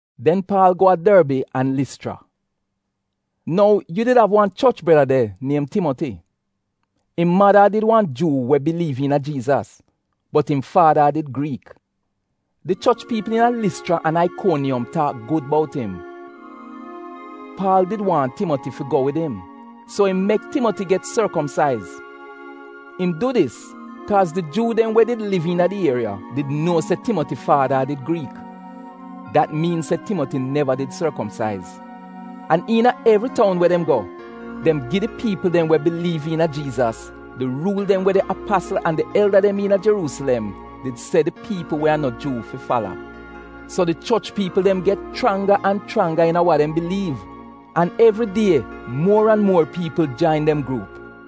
Den Paal go a Dorbi an Lischra. Nou yu did av wan choch breda de niem Timoti. Im mada a did wan Juu we biliiv iina Jiizas, bot im faada a did Griik. Di choch piipl iina Lischra an Aikoniyom taak gud bout im. Paal did waahn Timoti fi go wid im, so im mek Timoti get sorkomsaiz. Im du dis kaaz di Juu dem we did liv iina di ieriya did nuo se Timoti faada a did Griik. Dat miin se Timoti neva did sorkomsaiz. An iina evri toun we dem go, dem gi di piipl dem we biliiv iina Jiizas di ruul dem we di apasl an di elda dem iina Jeruusilem did se di piipl we a no Juu fi fala. So di choch piipl dem get chranga an chranga iina wa dem biliiv an evri die muor an muor piipl jain dem gruup.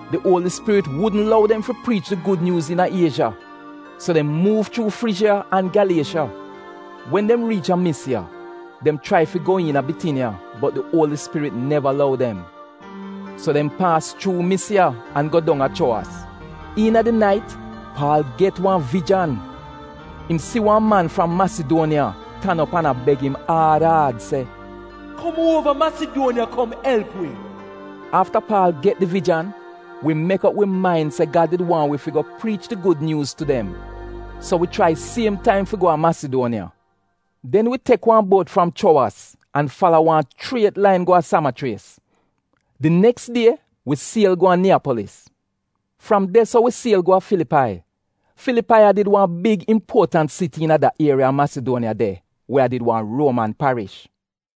Di Uoli Spirit wudn lou dem fi priich di gud nyuuz iina Iezha, so dem muuv chuu Frijiya an Gyaliesha. Wen dem riich a Misiya, dem chrai fi go iina Bitiniya, bot di Uoli Spirit neva lou dem. So dem paas chuu Misiya an go dong a Chuowas. Iina di nait Paal get wan vijan. Im si wan man fram Masiduoniya tan op an a beg im aad aad se, “Kom uova tu Masiduoniya kom elp wi!” Afta Paal get di vijan, wi mek op wi main se Gad did waahn wi fi go priich di Gud Nyuuz tu dem, so wi chrai siem taim fi go a Masiduoniya. Den wi tek wan buot fram Chuowas an fala wan chriet lain go a Samachries. Di neks die wi siel go a Niyapolis. Fram de-so wi siel go a Filipai. Filipai a did wan big impuotant siti iina da ieriya a Masiduoniya de we a did wan Ruoman parish.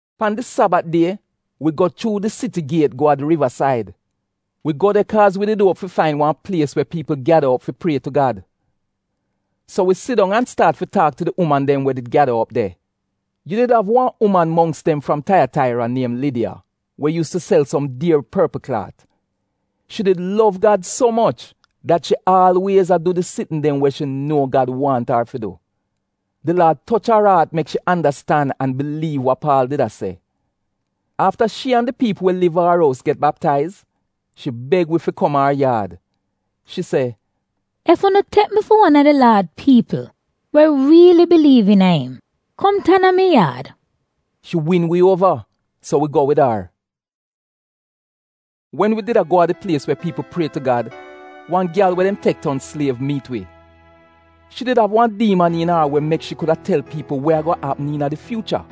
Pan di Sabat die wi go chuu di siti giet go a di rivasaid. Wi go de kaaz wi did uop fi fain wan plies we piipl gyada op fi prie tu Gad. So wi sidong an staat fi taak tu di uman dem we did gyada op de. Yu did av wan uman mongks dem fram Taiyataira niem Lidiya we yuus tu sel som dier porpl klaat. Shi did lov Gad so moch dat shi aalwiez a du di sitn dem we shi nuo Gad waahn ar fi du. Di Laad toch ar aat mek shi andastan an biliiv wa Paal did a se. Afta shi an di piipl we liv a ar ous get baptaiz, shi beg wi fi kom a ar yaad. Shi se, “Ef unu tek mi fi wan a di Laad piipl we riili biliiv iina im, kom tan a mi yaad.” Shi win wi uova, so wi go wid ar. Wen wi did a go a di plies we piipl prie tu Gad, wan gyal we dem tek ton sliev miit wi. Shi did av wan diiman iina ar we mek shi kuda tel piipl we ago apm iina di fyuucha.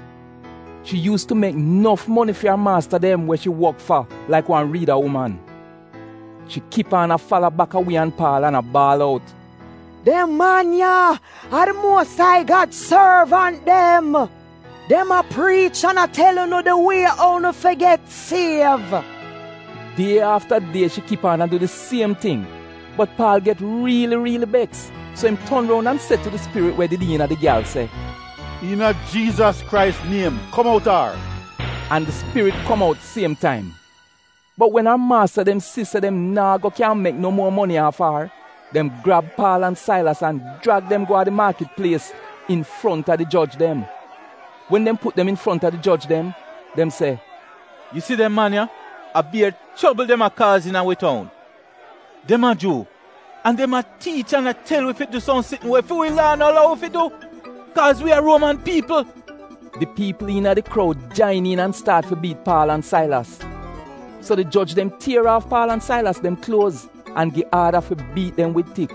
Shi yuus tu mek nof moni fi ar maasta dem we shi wok fa laik wan riida uman. Shi kip aan a fala baka wi an Paal an a baal out, “Dem man ya a di Muos ai Gad sorvant dem. Dem a priich an a tel unu di wie ou unu fi get siev.” Die afta die shi kip aan a du di siem ting. Bot Paal get riili riili beks. So im ton roun an se tu di spirit we did iina di gyal se, “Iina Jiizas Krais niem. Kom outa ar!” An di spirit kom out siem taim. Bot wen ar maasta dem si se dem naa go kyaahn mek no muor moni aaf a ar, dem grab Paal an Sailas an jrag dem go a di maakit plies infronta di joj dem. Wen dem put dem infronta di joj dem, dem se, “Yu si dem man ya, a bier chobl dem a kaaz iina wi toun. Dem a Juu an dem a tiich an a tel wi fi du som sitn we fi wi laa no lou wi fi du kaaz wi a Ruoman piipl.” Di piipl iina di kroud jain iin an staat fi biit Paal an Sailas. So di joj dem tier aaf Paal an Sailas dem kluoz an gi aada fi biit dem wid tik.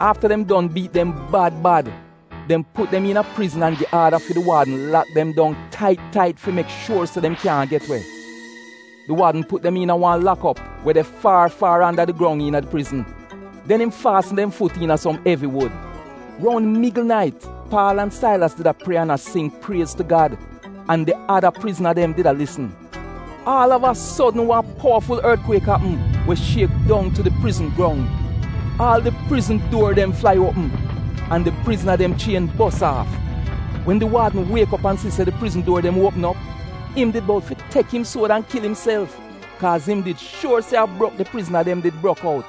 Afta dem don biit dem bad bad, dem put dem iina prizn an gi aada fi di waadn fi lak dem dong tait tait fi mek shuor se dem kyaahn get we. Di waadn put dem iina wan lak op we de far far anda di grong iina di prizn. Den im faasn dem fut iina som evi wud. Roun migl nait Paal an Sailas did a prie an a sing priez tu Gad, an di ada prizna dem did a lisn. Aal av a sodn wan powaful ortkwiek apm we shiek dong tu di prizn grong. Aal di prizn duor dem flai uopm, an di prizna dem chien bos aaf. Wen di waadn wiek op an si di prizn duor dem uopm op, im did bout fi tek im suod an kil imself, kaaz im did shuor se a brok di prizna dem did brok out.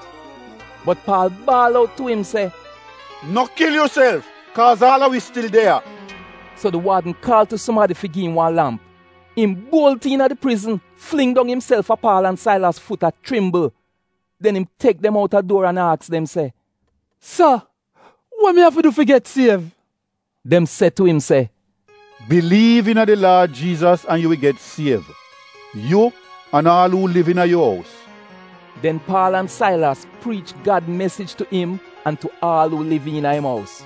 Bot Paal baal out tu im se, “No kil yuself kaaz aal a wi stil de ya!” So di waadn kaal tu sumadi fi gi im wan lamp. Im buolt iina di prizn, fling dong imself a Paal an Sailas fut a chrimbl. Den im tek dem outa duor an aks dem se, “Sa, wa mi afi du fi get siev?” Dem se tu im, “Biliiv iina di Laad Jiizas an yu wi get siev, yu an aal uu liv iina yu ous.” Den Paal an Sailas priich Gad mesij tu im an tu aal uu liv iina im ous.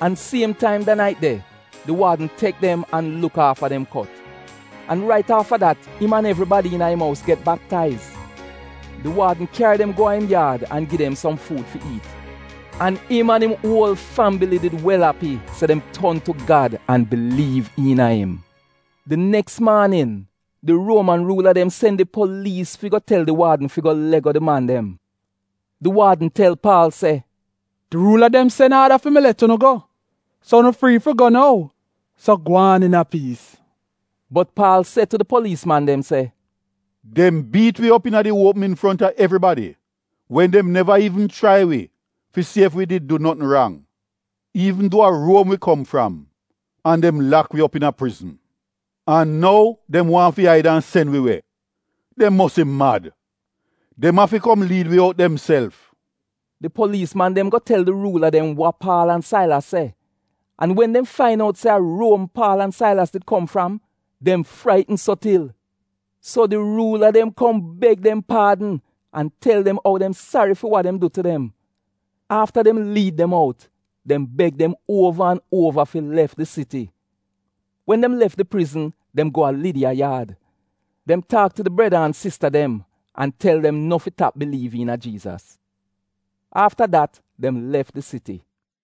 An siem taim da nait de, di waadn tek dem an luk aafa dem kot. An rait afta dat im an evribadi iina im ous get baptaiz. Di waadn kyari dem go a im yaad an gi dem som fuud fi iit. An im an im uol fambili did wel api se dem ton tu Gad an biliiv iina im. Di neks maanin di Ruoman ruula dem sen di poliis dem fi go tel di waadn fi let go di man dem. Di waadn tel Paal se, “Di ruula dem sen aada fi mi let unu go. So unu frii fi go nou, so gwaan iina piis.” Bot Paal se tu di poliis man dem se, “Dem biit wi op iina di uopm infronta evribadi wen dem neva iivn chrai wi fi si ef wi did du notn rang — iivn duo a Ruom wi kom fram an dem lak wi op iina prizn. An nou dem waahn fi aid an sen wi we. Dem mosi mad! Dem afi kom liid wi out demself!” Di poliis man dem go tel di ruula dem wa Paal an Sailas se. An wen dem fain out se a Ruom Paal an Sailas did kom fram, dem fraitn so til. So di ruula dem kom beg dem paadn an tel dem ou dem sari fi wa dem du tu dem. Afta dem liid dem out, dem beg dem uova an uova fi lef di siti. Wen dem lef di prizn, dem go a Lidiya yaad. Dem taak tu di breda an sista dem an tel dem no fi tap biliiv iina Jiizas. Afta dat dem lef di siti.